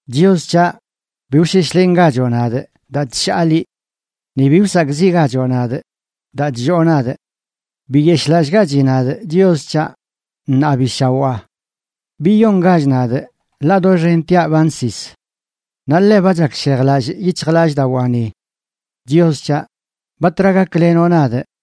Chios c̱haꞌ, bi wsheshlengachoꞌ nadꞌ, daa chshaa liꞌ. Ni bi wsakꞌziꞌgachoꞌ nadꞌ daa chlloo nadꞌ. Biyeshꞌlallꞌgachi nadꞌ, Chios c̱haꞌ, ṉaa bi shawaa. Biyongach nadꞌ, ḻaꞌ doxentiaꞌ ba nsis. Naꞌ ḻe ba chakshejlallꞌ yic̱hjlallꞌdawaani. Chios c̱haꞌ, ¿batra gaklenoꞌ nadꞌ?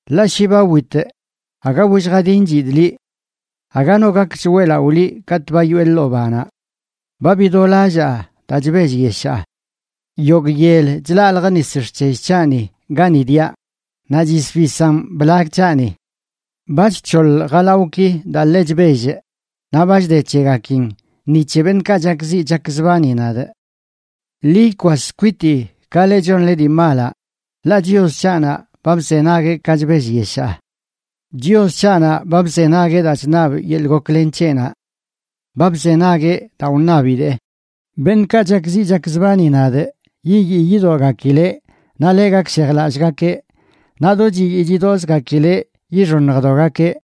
Ḻaꞌ shi ba witꞌ aga willjadinchidꞌ liꞌ. Aga no gakch weꞌlaꞌo liꞌ katꞌ ba yoꞌe ḻoo banaꞌ. Ba bidolallaa daa chbellyeshaa. Yogꞌ yel chlaljꞌ nis xc̱hell c̱haꞌni gani diaꞌ, naꞌ chisbisan blag c̱haꞌni. Ba chc̱hoḻ jalawꞌki daa ḻe chbellꞌ, naꞌ ba chde c̱hegakin ni c̱he beṉꞌkaꞌ chakziꞌ chakzbani nadꞌ. Ḻi ikwas kwitii, ka leꞌ chonle dii malaꞌ, ḻaꞌ Chios c̱haꞌnaꞌ ba bzenagueꞌ ka chbellyeshaa. Chios c̱haꞌnaꞌ ba bzenagueꞌ daa chṉabꞌ yeḻꞌ goklen c̱heꞌnaꞌ. Ba bzenagueꞌ daa wṉabidee. Beṉꞌkaꞌ chakziꞌ chakzbani nadꞌ yiyii yidogakileꞌ naꞌ ḻe gakshejlallꞌgakeꞌ. Naꞌ do chiyii chidoꞌzgakileꞌ yixoṉjdogakeꞌ.